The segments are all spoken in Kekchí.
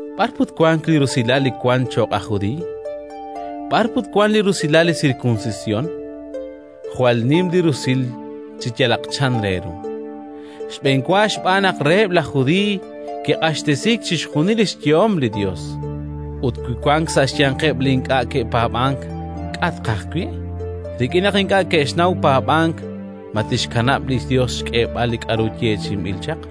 B'ar put wank li rusilal li wank cho'q aj judiiy? B'ar put wank li rusilal li sirkunsisyon? Jwal nim li rusil, chi yalaq chan re ru. Xb'enwa xb'aan naq reheb' laj Judiiy kiq'axtesiik chixjunil li xyehom li Yos. Ut wi wank sa' xyanqeb' li ink'a' ke'paab'ank, k'a' tqaj wi'? Rik'in naq ink'a' ke'xnaw paab'ank ma tixkanab' li Yos xk'eeb'al li k'aru kixyeechi'i chaq?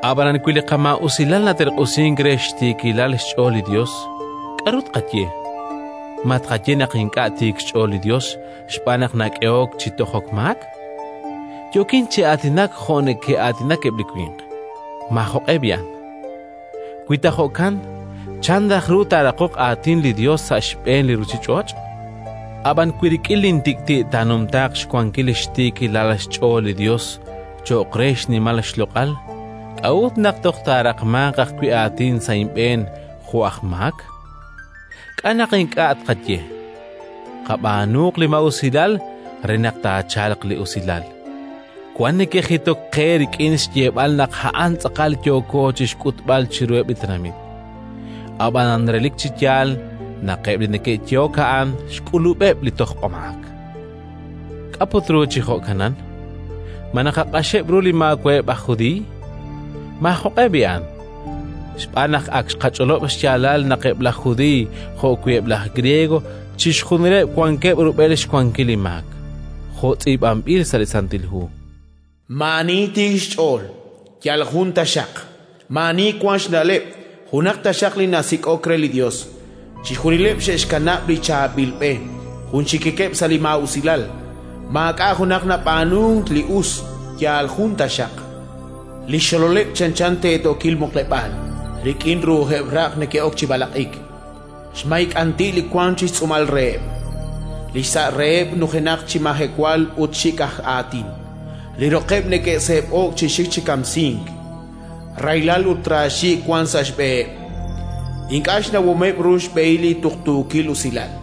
Ab'anan wi li qamaa'usilal naterq'usink re xtiikilal xch'ool li Yos, k'aru tqaye? Ma tqaye naq ink'a' tiik xch'ool li Yos xb'aan naq nak'ehok chi tojok maak? (Yookin chi aatinak jo' neke'aatinak eb' li winq). Maajoq'e b'i'an! Wi ta jo'kan, chan raj ru taaraqoq aatin li Yos sa' xb'een li ruuchich'och'? Ab'an wi rik'in lintik'ti' taanumtaaq xwankil xtiikilal xch'ool li Yos cho'q re xnimal xloq'al, k'a'ut naq toj naraqmank ajwi' aatin sa' inb'een jo' aj maak? K'a' naq ink'a' tqaye: “Qab'aanuuq li maa'usilal re naq taachalq li usilal”? Wank neke'jitok qe rik'in xyeeb'al naq a'an tz'aqal li yooko chi xk'utb'al chiruheb' li tenamit. Ab'anan relik chi yaal naq eb' li neke'yehok a'an xk'ulub'eb' li tojb'amaak. K'a' put ru chi jo'kanan? Ma naqaq'axeb' ru li maawa'eb' aj Judiiy? Maajoq'e b'i'an! Xb'aan naq ak xqach'olob' xyaalal naq eb' laj Judiiy jo'wi' eb' laj Griego, chixjunileb' wankeb' rub'el xwankil li maak, jo' tz'iib'anb'il sa' li Santil Hu: “Maa'ani tiik xch'ool, yal jun taxaq. Maa'ani wank xna'leb', junaq taxaq li nasik'ok re li Yos. Chixjunileb' xe'xkanab' li chaab'il b'e, junxikikeb' sa' li maa'usilal. Maak'a' junaq nab'aanunk li us, yal jun taxaq. Li xxololeb' chanchan teetookil muqleb'aal; rik'in ru'ujeb' raq' neke'ok chi b'alaq'ik. Xmay k'anti' li wank chi xtz'uumal reheb'. Li xsa' reheb' nujenaq chi majewal ut xik' aj aatin. Li roqeb' neke'seeb'o'k chi xik chi kamsink; rahilal ut raaxiik' wank sa' xb'eheb'. Ink'a' xnawomeb' ru xb'ehil li tuqtuukil usilal;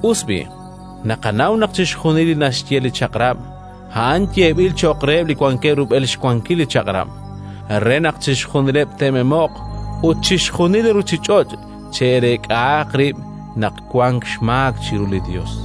Us b'i', naqanaw naq chixjunil li naxye li Chaq'rab', a'an yeeb'il cho'q reheb' li wankeb' rub'el xwankil li Chaq'rab', re naq chixjunileb' te'memo'q, ut chixjunil li ruuchich'och' chireek'ahaq rib' naq wank xmaak chiru li Yos.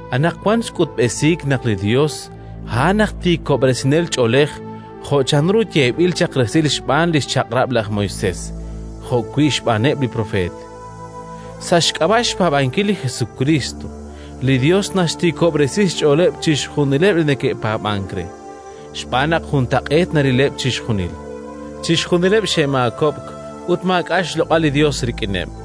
Anaqwan xk'utb'esiik naq li Yos a'an aj tiikob'resinel ch'oolej, jo' chanru yeeb'il chaq resil xb'aan li xChaq'rab' laj Moisés jo'wi' xb'aaneb' li propeet. Sa' xk'ab'a' xpaab'ankil li Jesukriist, li Yos naxtiikob'resi xch'ooleb' chixjunileb' li neke'paab'ank re, xb'aan naq juntaq'eet narileb' chixjunil: chixjunileb' xe'maakob'k ut maak'a' xloq'al li Yos rik'ineb'.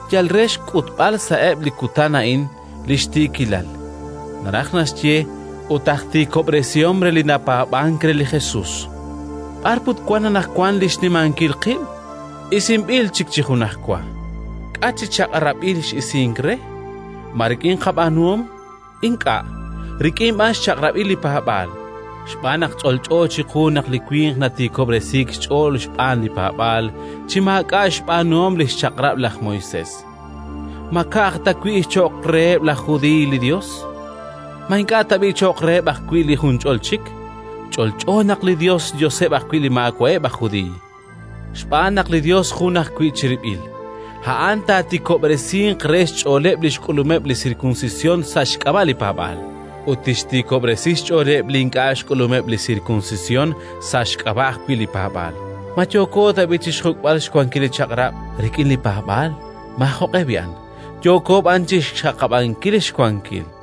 yal re xk'utb'al sa'eb' li kutan a'in li xtiikilal; naraj naxye, a'an tiik xch'ool ut aj tiikob'resihom re li napaab'ank re li Jesus. B'ar put wank anaqwan li xnimankil qib'? Isinb'il chik chi junajwa. K'a' chi chaq'rab'il x'isink re? Ma rik'in qab'aanuhom? Ink'a'; rik'in b'an xchaq'rab'il li paab'aal. Xb'aan naq ch'olch'o chiqu naq li winq natiikob'resiik xch'ool xb'aan li paab'aal, chi maak'a' xb'aanuhom li xChaq'rab' laj Moisés. Ma ka'aj ta wi' cho'q reheb' laj Judiiy li Yos? Ma ink'a' tab'i' cho'q reheb' ajwi' li junch'ol chik? Ch'olch'o naq li Yos xYoseb' ajwi' li maawa'eb' aj Judiiy. Xb'aan naq li Yos jun ajwi' chirib'il: a'an taatiikob'resinq re xch'ooleb' li xk'ulumeb' li sirkunsisyon, sa' xk'ab'a' li paab'aal; ut tixtiikob'resi xch'ooleb' li ink'a' xk'ulumeb' li sirkunsisyon, sa' xk'ab'a' ajwi' li paab'aal. Ma yooko tab'i' chi xjuk'b'al xwankil li Chaq'rab' rik'in li paab'aal? Maajoq'e b'i'an! Yooko b'an chi xxaqab'ankil xwankil.